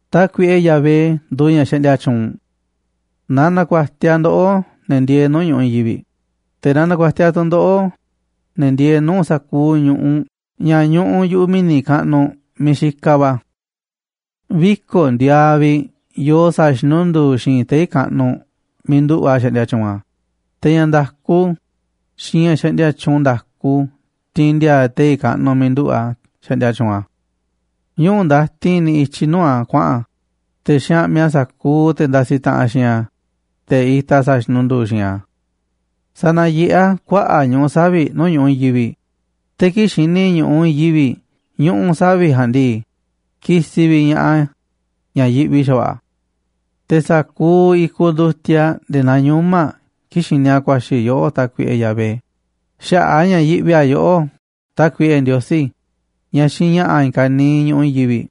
Tákuiꞌe Yahvé nduuꞌ ña̱ xaꞌndia tyuunꞌ. Na na̱ku̱a̱tiaꞌ ndoꞌó, ne̱ ndieeꞌ nuu̱ꞌ ñu̱ꞌuꞌ i̱i̱n yivi̱ꞌ, te̱ na na̱ku̱a̱tiaꞌ tu̱ ndoꞌó, ne̱ ndieeꞌ nuu̱ꞌ sa̱kuuꞌ ñu̱ꞌuꞌ ña̱ ñuꞌuꞌ yu̱ꞌuꞌ mi̱ni̱ kaꞌnuꞌ miiꞌ xikaꞌ va̱. Viko̱ꞌ ndiaaꞌ vi̱ꞌ yoo sa̱a̱ xinundu̱u̱ xi̱i̱nꞌ tei̱ kaꞌnuꞌ miiꞌ nduꞌu̱ꞌ a̱ xaꞌndia tyuunꞌ a̱, te̱ ña̱ nda̱ku xiinꞌ ña̱ xaꞌndia tyuunꞌ nda̱ku tiinꞌ ndiaa tei̱ kaꞌnuꞌ miiꞌ nduꞌu̱ꞌ a̱ xaꞌndia tyuunꞌ a̱. Ñuꞌu̱ ndatin niꞌiꞌ i̱tyiꞌ nuu̱ꞌ a̱ kuaꞌa̱n a̱, te̱ xaꞌmiꞌ a̱ sa̱kuuꞌ te̱ ndasiꞌ taꞌanꞌ xiinꞌ a̱, te̱ itaꞌ sa̱a̱ xinundu̱u̱ xi̱i̱nꞌ a̱. Sanayeꞌé a̱ kuaꞌa̱ꞌ ñuꞌu̱ savi̱ꞌ nuu̱ꞌ ñu̱ꞌuꞌ i̱i̱n yivi̱ꞌ, te̱ kii̱ꞌ xini ñu̱ꞌuꞌ i̱i̱n yivi̱ꞌ ñuꞌu̱ savi̱ꞌ ja̱a̱nꞌ ndii, kisiꞌ vi̱ꞌ ña̱ꞌaꞌ a̱ ña̱ yiꞌvi xa̱va̱ꞌa̱ a̱. Te̱ sa̱kuuꞌ i̱kuꞌ ndutiaꞌ nde̱e̱ naa ñuma̱ꞌ kii̱ꞌ xini a̱ ku̱a̱xi̱ yoꞌó, Tákuiꞌe Yahvé, xaꞌa̱ꞌ a̱ ña̱ yiꞌvi a̱ yoꞌó, Tákuiꞌe Ndiosí, ña̱ xiinꞌ ña̱ꞌa̱ i̱i̱n ka̱niiꞌ ñu̱ꞌuꞌ i̱i̱n yivi̱ꞌ.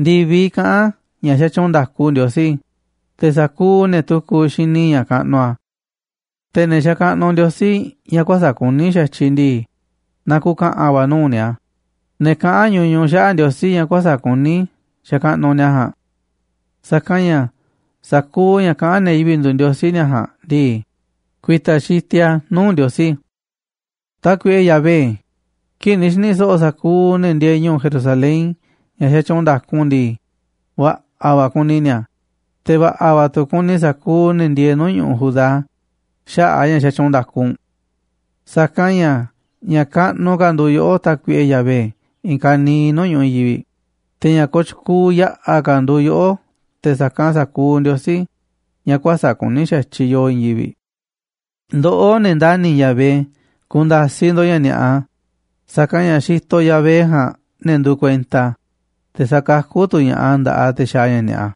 Ndi̱viꞌ kaꞌán ña̱ xatyuunꞌ nda̱ku Ndiosí, te̱ sa̱kuuꞌ ne̱ tukuꞌ xini ña̱ kaꞌnuꞌ a̱. Te̱ ne̱ xakaꞌnuꞌ ndiosí ña̱ kuäsa̱ꞌ kuní xa̱tyiꞌ ndii, na ku̱ka̱ꞌa̱n va̱ nuu̱ꞌ ni̱a̱, ne̱ kaꞌán ñuñuꞌ xaꞌa̱ꞌ ndiosí ña̱ kuäsa̱ꞌ kuní xakaꞌnuꞌ ni̱a̱ ja̱a̱nꞌ. Sa̱kanꞌ ña̱ sa̱kuuꞌ ña̱ kaꞌán ne̱ yivi̱ꞌ nduuꞌ ndiosí ni̱a̱ ja̱a̱nꞌ ndii, ku̱i̱ta̱ xitiꞌ a̱ nuu̱ꞌ Ndiosí. Tákuiꞌe Yahvé, kii̱ꞌ ni̱ xi̱ni̱ so̱ꞌo̱ sa̱kuuꞌ ne̱ ndieeꞌ ñu̱u̱ Jerusalén ña̱ xatyuunꞌ nda̱ku u̱nꞌ ndii, va̱ꞌa̱ va̱ kuni ni̱a̱, te̱ va̱ꞌa̱ tu̱ kuni sa̱kuuꞌ ne̱ ndieeꞌ nuu̱ꞌ ñu̱ꞌuꞌ Judá xaꞌa̱ꞌ a̱ ña̱ xatyuunꞌ nda̱ku u̱nꞌ. Sa̱kanꞌ ña̱ ña̱ kaꞌnuꞌ ka̱ nduuꞌ yoꞌó, Tákuiꞌe Yahvé, i̱i̱n ka̱niiꞌ nuu̱ꞌ ñu̱ꞌuꞌ i̱i̱n yivi̱ꞌ, te̱ ña̱ kooꞌ tyukuuꞌ yaꞌa̱ ka̱ nduuꞌ yoꞌó te̱ sa̱kanꞌ sa̱kuuꞌ ndiosí ña̱ kuäsa̱ꞌ kuní xa̱tyiꞌ yoo i̱i̱n yivi̱ꞌ. Ndoꞌó, ne̱ ndani̱ Yahvé, ku̱nda̱siꞌ ndo̱ꞌ ña̱ ni̱a̱ꞌa, sa̱kanꞌ ña̱ xitoꞌ Yahvé ja̱a̱nꞌ ne̱ nduuꞌ kuenta a̱, te̱ sakakú tu̱ ña̱ꞌaꞌ a̱ nda̱ꞌaꞌ te̱ xaaꞌ ña̱ ni̱a̱ꞌa.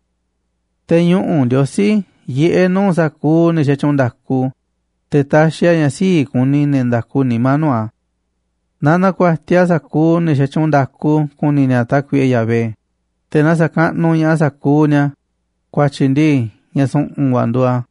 Te̱ ñuꞌu̱ Ndiosí yiꞌé nuu̱ꞌ sa̱kuuꞌ ne̱ xatyuunꞌ nda̱ku, te̱ taxiꞌ a̱ ña̱ sii̱ꞌ kuni ne̱ nda̱ku nimá nuu̱ꞌ a̱. Na na̱ku̱a̱tiaꞌ sa̱kuuꞌ ne̱ xatyuunꞌ nda̱ku ku̱ni̱ ni̱a̱ Tákuiꞌe Yahvé, te̱ na sa̱kaꞌnuꞌ ña̱ꞌaꞌ sa̱kuuꞌ ni̱a̱, ku̱a̱tyi̱ ndii, ña̱ su̱ꞌu̱n va̱ nduuꞌ a̱.